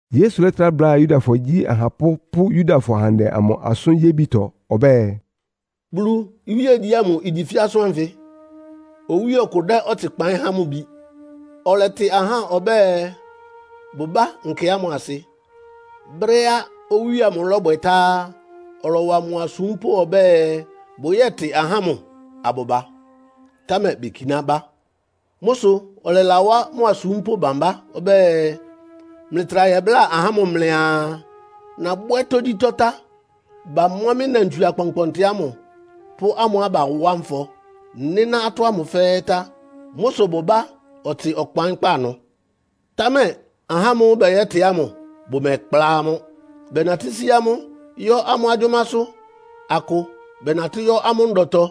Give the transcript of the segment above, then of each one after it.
Yesu lɛ́trá bláa Yudafɔ igyi ahapʋ́ pʋ́ Yudafɔ ahandɛ amʋ asʋ́n yébitɔ ɔbɛ́ɛ, “Bulu iwíegyí ámʋ igyi fɛ́ asʋ́n ánfɩ. Owíe ɔkʋ dɛ́ ɔtsɩ kpaɩ́n há mʋ bi, ɔlɛtɩ ahá ɔbɛ́ɛ, bʋbá nkɛ ámʋ asɩ. Brɛ́á owíe ámʋ lɔ́bwɛ tá á, ɔlɔwa mʋ asúmpʋ́ ɔbɛ́ɛ, bʋyɛ́tɩ ahá ámʋ abʋba, támɛ bekiná bá. Mʋ́ sʋ ɔlɛlawá mʋ asúmpʋ́ bámbá ɔbɛ́ɛ, ‘Mlɩtra yɛbláa ahá ámʋ mlɩaa, nabwɛ́ tógyítɔ́ tá. Bamɔ́ mɩ́ nnantswie akpɔnkpɔntɩ ámʋ pʋ́ amʋ́á bawá nfɔ, nɩ́ná atɔ́ ámʋ fɛ́ɛ́ tá. Mʋ́ sʋ bʋbá ɔtsɩ ɔkpaɩ́nkpá ɩnʋ.’ Támɛ ahá ámʋ́ʋ́ bɛyɛ́tɩ ámʋ bʋmɛkplá amʋ́. Bɛnatɩ́ sí amʋ́ yɔ́ amʋ́ agyʋ́másʋ́. Akʋ bɛnatɩ́ yɔ́ amʋ́ ndɔtɔ.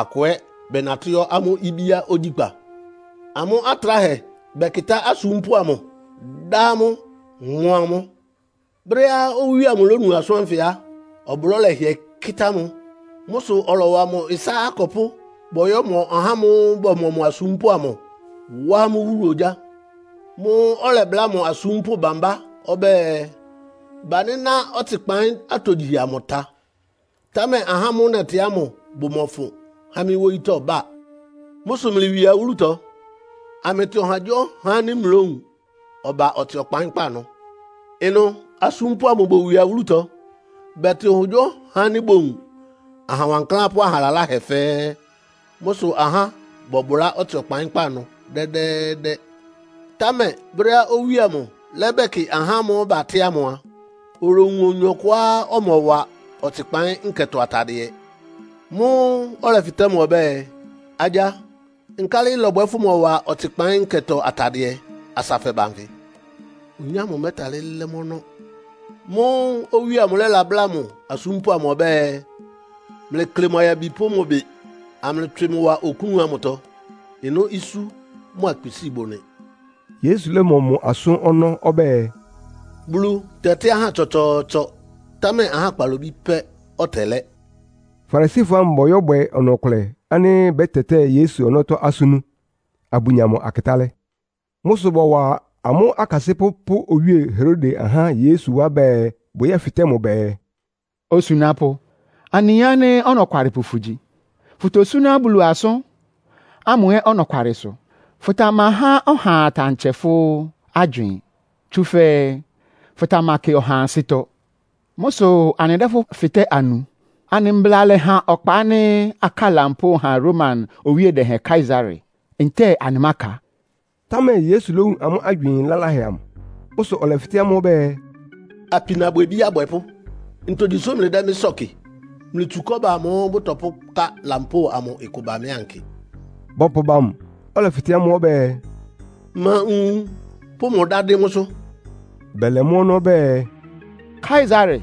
Akʋ ɛ́ bɛnatɩ́ yɔ́ amʋ́ ibíá ogyíkpá. Amʋ́ atráhɛ bɛkɩtá asúmpʋ́ amʋ, dá amʋ́, mɔ́ amʋ́. Brɛ́á owíe amʋ lónu asʋ́n ánfɩ á, ɔblɔ́ lɛhɩɛ́ kɩ́tá mʋ. Mʋ́ sʋ ɔlɔwa mʋ ɩsá akɔpʋ́, bɔyɔ́mɔ ahá ámʋ́ʋ́ bɔmɔ mʋ asúmpʋ́ amʋ, wá amʋ́ wúlu ogyá. Mʋ́ʋ́ ɔlɛbláa mʋ asúmpʋ́ bámbá ɔbɛ́ɛ, ‘Banɩ́ná ɔtsɩkpaɩ́n atogyihɛ amʋ tá, támɛ ahá ámʋ́ʋ́ nɛtɩ ámʋ bʋmɔfʋn ha mɩ́ wóyítɔ́ ba. Mʋ́ sʋ mlɩwie awúlutɔ, amlɩtɩ ɔhagyíɔha ánɩ́ mlówun, ɔba ɔtsɩ ɔkpaɩ́nkpá ɩnʋ.’ Ɩnʋ asúmpʋ́ amʋ bowie awúlutɔ. Bɛtɩ ɔhagyíɔha ánɩ́ bowun, aha wankláán pʋ́ aha laláhɛ fɛ́ɛ́. Mʋ́ sʋ ahá bɔbʋlá ɔtsɩ ɔkpaɩ́nkpá ɩnʋ dɛ́dɛ́ɛ́dɛ́. “Támɛ brɛ́á owíe amʋ lɛ́bɛkɩ ahá ámʋ́ʋ́ batɩ́ ámʋ a, olowun oyin ɔkʋá ɔmɔwa ɔtsɩkpaɩ́n nkɛtɔ atadɩɛ. Mʋ́ʋ́ ɔlɛfɩtɛ́ mʋ ɔbɛ́ɛ, ‘Agya, nkálɩ ɩlɔbwɛ fʋmɔwa ɔtsɩkpaɩ́n nkɛtɔ atadɩɛ asa fɛba nfɩ?’ Oyin ámʋ mɛ́talɩ́ lɛ́ mʋ́ ɔnɔ́. Mʋ́ʋ́ owíe amʋ lɛ́labláa mʋ asúmpʋ́ ɔbɛ́ɛ, ‘Mlɩklɩ mʋ ayabi pʋ́ mʋ ɩbɩ, amlɩtswɩ mʋ wa oklún amʋtɔ. Ɩnʋ́ isú mʋ́a kpisíi bʋ nɩ.’” Yesu lɔ́mɔ mʋ asʋ́n ɔnɔ́ ɔbɛ́ɛ, “Bulu tɛtɩ́ ahá tsɔtsɔɔtsɔ, támɛ ahá kpalobí pɛ́ ɔtɛlɛ́.” Farisifɔ ámʋ bɔyɔ́bwɛ ɔnɔ-ɔkʋlɛ ánɩ́ bɛ́tɛtɛ́ɛ Yesu ɔnɔ́tɔ́ asʋ́n nú, abʋnya mʋ akɩtálɛ́. Mʋ́ sʋ bɔwa amʋ́ akasɩ́pʋ́ pʋ́ Owíe Herode ahá Yesu wá bɛɛ bʋyɛ́fɩtɛ́ mʋ bɛɛ, “Osunápʋ́, anɩyin ánɩ́ ɔnɔkwalɩpʋ fʋgyi, fʋ́tosúná Bulu asʋ́n ámʋ ɛ́ ɔnɔkwalɩsʋ. Fʋtamahá ɔhaa ɔtsɛ fʋ́ agywɩɩn, tsúfɛ́ fʋtamakɩ ɔhaa ansɩ́tɔ́. Mʋ́ sʋ anɩdɛ́ fʋ́ fɩtɛ́ anu. Anɩ mbla lɛ́ha ɔkpa ánɩ́ akáa lampóo ha Roma owíe dɛhɛn Kaesare, ntɛ́ɛ anɩmáka?” Támɛ Yesu lówun amʋ́ agywɩɩn laláhɛ amʋ. Mʋ́ sʋ ɔlɛfɩtɛ́ amʋ́ ɔbɛ́ɛ, “Apinabwɛbí abwɛpʋ́, ntogyi sʋ́ mlɩdɛ́ mɩ́ sɔ́ɔ kɩ? Mlɩtsu kɔ́ba amʋ́ʋ́ bʋtɔpʋ́ká lampóo amʋ ɩkʋ ba mɩ ankɩ.” Bɔpʋba mʋ, ɔlɛfɩtɛ́ amʋ́ ɔbɛ́ɛ, “Ma nwun pʋ́ mʋ dá dɩ́n mʋ́sʋ́?” Bɛlɛ mʋ́ ɔnɔ́ bɛɛ, “Kaesare.”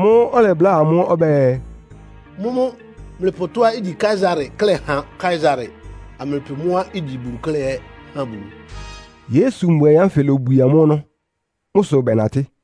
Mʋ́ʋ́ ɔlɛbláa amʋ́ ɔbɛ́ɛ, “Mʋ́mʋ́ mlɩpʋ tɔ́á igyi Kaesare klɛ́ ha Kaesare, amlɩpʋ mʋ́á igyi Bulu klɛ́ ɛ́ ha Bulu.” Yesu mbuaɩ ánfɩ lóbwie amʋ́ ɔnɔ́. Mʋ́ sʋ bɛnatɩ́.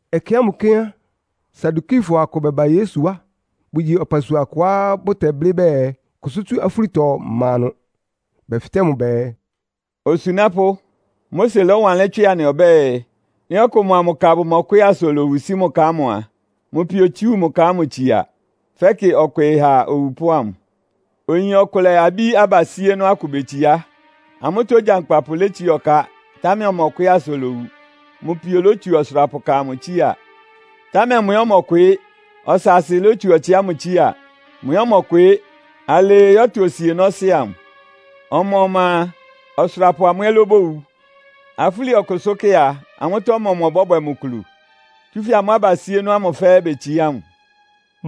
Ɛkɛ ámʋ kɛ́n á, Sadukifɔ akʋ bɛba Yesu wá. Bʋgyi ɔpasua kʋá bʋtɛblɩ́ bɛɛ, kʋsʋ́ tsú afúlitɔ má ɩnʋ. Bɛfɩtɛ́ mʋ bɛɛ, “Osunápʋ́, Mose lɔ́wanlɩ́n tswɩ anɩ ɔbɛ́ɛ, ‘Nɩ́ ɔkʋ mʋa mʋ ka bʋmɔkwɩɩ́ asa olowu sí mʋ ka ámʋ a, mʋ pio otsú mʋ ka ámʋ tsia, fɛ́kɩ ɔkwɩɩ ha owupʋ́ ámʋ.’ Oyin ɔkʋlɛ abí abasíénɔ́ akʋ betsiá. Amʋ́tɔ́ ogyankpapʋ létsiá ɔká, támɛ ɔmɔkwɩɩ́ asa olowu. Mʋ pio lótsu ɔsʋrapʋka amʋ tsía, támɛ mʋ ɛ́ ɔmɔkwɩɩ́. Ɔsaasɩ lótsu ɔtsɩ ámʋ tsía. Mʋ ɛ́ ɔmɔkwɩɩ́. Alɩɩ yɔ́tʋ osienɔ́sɩ́ amʋ. Ɔma-ɔma a, ɔsʋrapʋ mʋ ɛ́ lóbowu. Afúli ɔkʋsʋ́kɛ́ a, amʋ́tɔ́ ɔmɔmʋ ɔbɔ́bwɛ mʋ kulu? Tsúfɛ́ amʋ́ abasíénɔ́ ámʋ fɛ́ɛ́ betsiá mʋ.”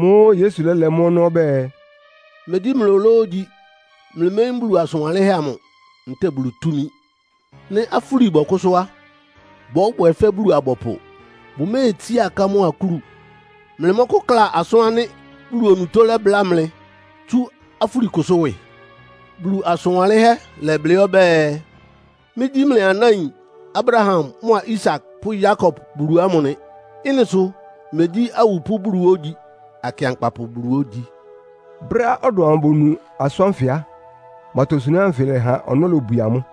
Mʋ́ʋ́ Yesu lɛ́lɛ mʋ́ ɔnɔ́ ɔbɛ́ɛ, “Megyí mlɩ ológyi. Mlɩméyín Bulu asʋn wanlɩ́nhɛ́ amʋ ntɛ́ɛ Bulu túmi. Nɩ́ afúli bɔkʋ́sʋ́ á, bɔ́bwɛ fɛ́ Bulu-abɔpʋ. Bʋméetsiá aká mʋ́a akúlu. Mlɩmɔ́kʋ́kla asʋ́n ánɩ́ Bulu onutó lɛ́bláa mlɩ tsú afúlikʋsʋ́ ɩwɩ? Bulu asʋn wanlɩ́nhɛ́ lɛ́blɩ́ ɔbɛ́ɛ, ‘Mɩ́gyí mlɩ anáin Abraham mʋa Isak pʋ́ Yakob Bulu ámʋ nɩ.’ Ɩ́nɩ sʋ megyí awupʋ́ Bulu ógyi, akɩankpapʋ Bulu ógyi.” Brɛ́á ɔdɔm amʋ bonu asʋ́n ánfɩ á, mʋ atosunáhɛ́ anfɩ lɛha ɔnɔ́ lobwie amʋ́.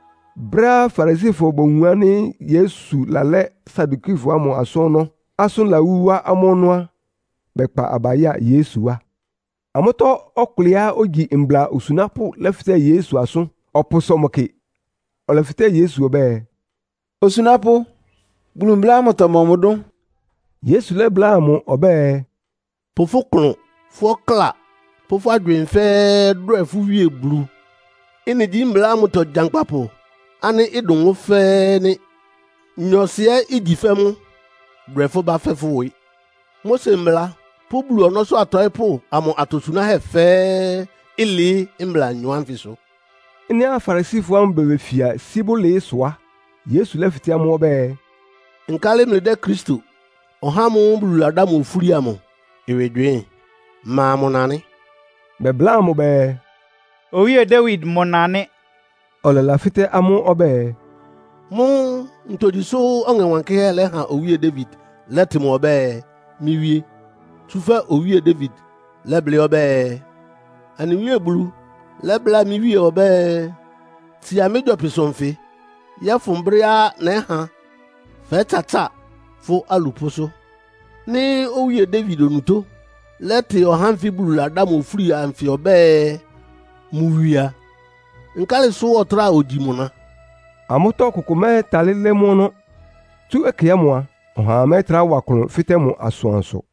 Brɛ́á Farisifɔ bowun ánɩ́ Yesu lalɛ́ Sadukifɔ ámʋ asʋ́n ɔnɔ́, asʋ́n lawú wá amʋ́ ɔnɔ́ á, bɛkpa aba ya Yesu wá. Amʋ́tɔ́ ɔkʋlɛá ogyi mbla osunápʋ́ lɛ́fɩtɛ́ Yesu asʋ́n, ɔpʋsɔ mʋ kɩ. Ɔlɛfɩtɛ́ Yesu ɔbɛ́ɛ, “Osunápʋ́, Bulu mbla ámʋtɔ mɔmʋ dʋ́n?” Yesu lɛ́bláa mʋ ɔbɛ́ɛ, “ ‘Pʋ fʋ́ klʋn, fʋ́ ɔkláa pʋ́ fʋ́ agywɩɩn fɛ́ɛ́ dwɛ fʋ́ Wíe Bulu.’ Ɩ́nɩ gyí mbla ámʋtɔ gyankpapʋ ánɩ́ ɩdʋn mʋ́ fɛ́ɛ́ nɩ́. Nyɔɔsɩ ɛ́ igyi fɛ́ mʋ́. ‘Dwɛ fʋ́ bá fɛ́ fʋ́ ɩwɩ.’ Mose Mbla pʋ́ Bulu ɔnɔ́sʋ́ atɔɩ́pʋ́ amʋ atosunáhɛ́ fɛ́ɛ́ ɩlɩɩ́ mbla anyɔ ánfɩsʋ.” Ɩ́nɩá Farisifɔ ámʋ bebefia sí bʋlɩɩ́ sʋ á, Yesu lɛ́fɩtɛ́ amʋ́ ɔbɛ́ɛ, “Nkálɩ mlɩdɛ́ Kristo, (ɔhá ámʋ́ʋ́ Bulu ladá mʋ ofúli amʋ) ɩwɩ gywɩɩ́n? Ma mʋ na nɩ́?” Bɛbláa mʋ bɛɛ, “Owíe Dawid mʋ na nɩ́.” Ɔlɛlafɩ́tɛ́ amʋ́ ɔbɛ́ɛ, “Mʋ́ ntogyi sʋ́ Ɔŋɛ Wankɩ́hɛ́ lɛ́ha Owíe Dawid lɛ́tɩ mʋ ɔbɛ́ɛ ‘Mɩ́ Wíé?’ Tsúfɛ́ Owíe Dawid lɛ́blɩ́ ɔbɛ́ɛ, ‘Anɩ Wíe Bulu lɛ́bláa mɩ́ Wíe ɔbɛ́ɛ, Tsia mɩ́ gyɔpɩsʋ nfɩ yɔ́fʋn brɛ́á nɛ́ha fɛ́tsatsáa fʋ́ alupʋ́sʋ́?’ Nɩ́ Owíe Dawid onutó lɛ́tɩ ɔhá ánfɩ Bulu ladá ofúli anfɩ ɔbɛ́ɛ, mʋ wie a, nkálɩ sʋ́ ɔtráa ogyi mʋ na?” Amʋ́tɔ́ ɔkʋkʋ mɛ́talɩ́ lɛ́ mʋ́ ɔnɔ́. Tsú ɛkɛ ámʋ a, ɔhaa mɛ́trá wa klʋn fɩtɛ́ mʋ asʋansʋ.